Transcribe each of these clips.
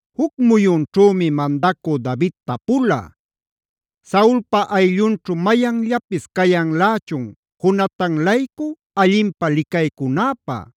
Juc muyunćhümi mandacü David tapula: “¿Saulpa ayllunćhu mayanllapis cayanlächun Jonatan-laycu allinpä licaycunäpä?”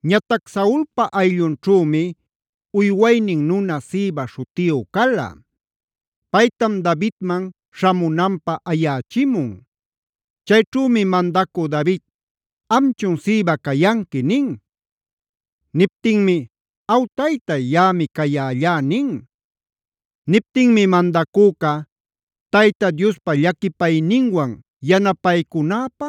Ñatac Saulpa ayllunćhümi uywaynin nuna Siba śhutiyu cala. Paytam Davidman śhamunanpä ayächimun. Chayćhümi mandacü David: “¿Amchun Siba cayanqui?” nin. Niptinmi: “Aw taytay, yaꞌami cayällá” nin. Niptinmi mandacüca: “Tayta Diospa llaquipayninwan yanapaycunäpä,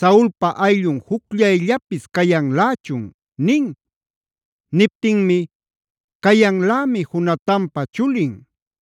¿Saulpa ayllun jucllayllapis cayanlächun?” nin. Niptinmi: “Cayanlämi Jonatanpa chulin.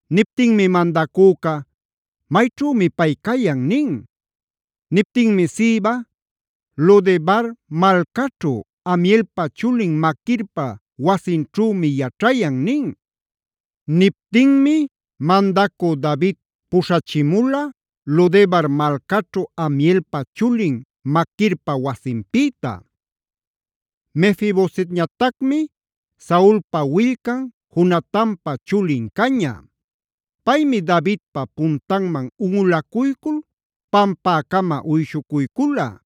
Niptinmi mandacüca: “¿Mayćhümi pay cayan?” nin. Niptinmi Siba: “Lo-debar malcaćhu, Amielpa chulin Maquirpa wasinćhümi yaćhayan” nin. Niptinmi mandacü David puśhachimula Lo-debar malcaćhu Amielpa chulin Maquirpa wasinpïta. Mefi-bosetñatacmari Saulpa willcan, Jonatanpa chulin caña. Paymi Davidpa puntanman unꞌulacuycul pampäcama uyshucuycula.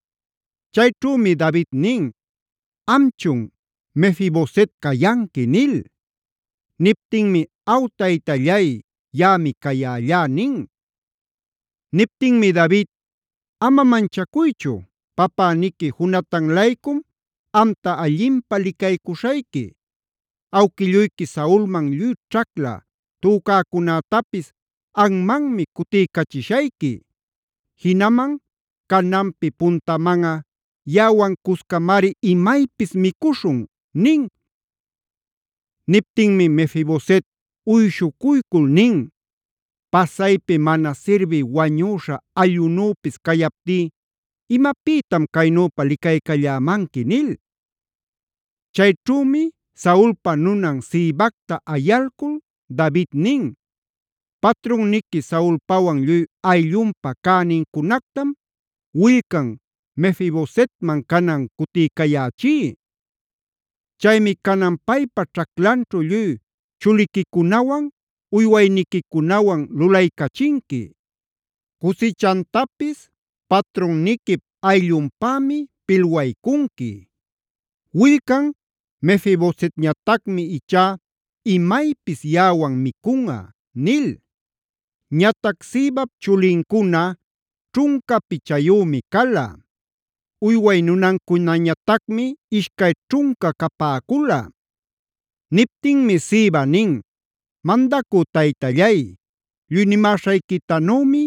Chayćhümi David nin: “¿Amchun Mefi-boset cayanqui?” nil. Niptinmi: “Aw taytallay, yaꞌami cayällá” nin. Niptinmi David: “Ama manchacuychu, papäniqui Jonatan-laycum amta allinpä licaycuśhayqui. Awquilluyqui Saulman lluy ćhacla tücäcunätapis anmanmi cutiycachishayqui. Jinaman cananpi puntamanꞌa yaꞌawan cuscamari imaypis micuśhun” nin. Niptinmi Mefi-boset uyshucuycul nin: “Pasaypi mana sirbï wañüśha allꞌunüpis cayaptí, ¿imapïtam caynüpa licaycallämanqui?” nil. Chayćhümi Saulpa nunan Sibacta ayalcul David nin: “Patrunniqui Saulpawan lluy ayllunpa cänincunactam willcan Mefi-bosetman canan cutiycayächí. Chaymi canan paypa ćhaclanćhu lluy chuliquicunawan, uywayniquicunawan lulaycachinqui. Cusichantapis patrunniquip ayllunpämi pilwaycunqui. Willcan Mefi-bosetñatacmi ichá imaypis yaꞌawan micunꞌa” nil. (Ñatac Sibap chulincuna ćhunca pichayümi cala; uyway nunancunañatacmi ishcay ćhunca capäcula.) Niptinmi Siba nin: “Mandacü taytallay, lluy nimäśhayquitanümi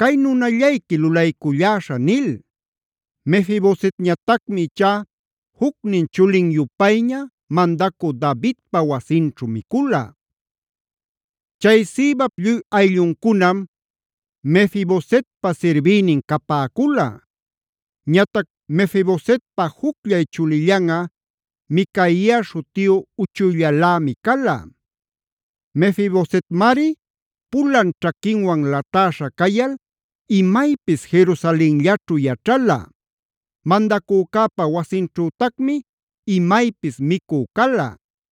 cay nunallayqui lulayculläśhä” nil. Mefi-bosetñatacmi ichá jucnin chulin-yupayña mandacü Davidpa wasinćhu micula. Chay Sibap lluy aylluncunam Mefi-bosetpa sirbïnin capäcula. Ñatac Mefi-bosetpa jucllay chulillanꞌa Micaia śhutiyu uchuyllalämi cala. Mefi-bosetmari pulan ćhaquinwan latäśha cayal imaypis Jerusalenllaćhu yaćhala; mandacücäpa wasinćhütacmi imaypis micü cala.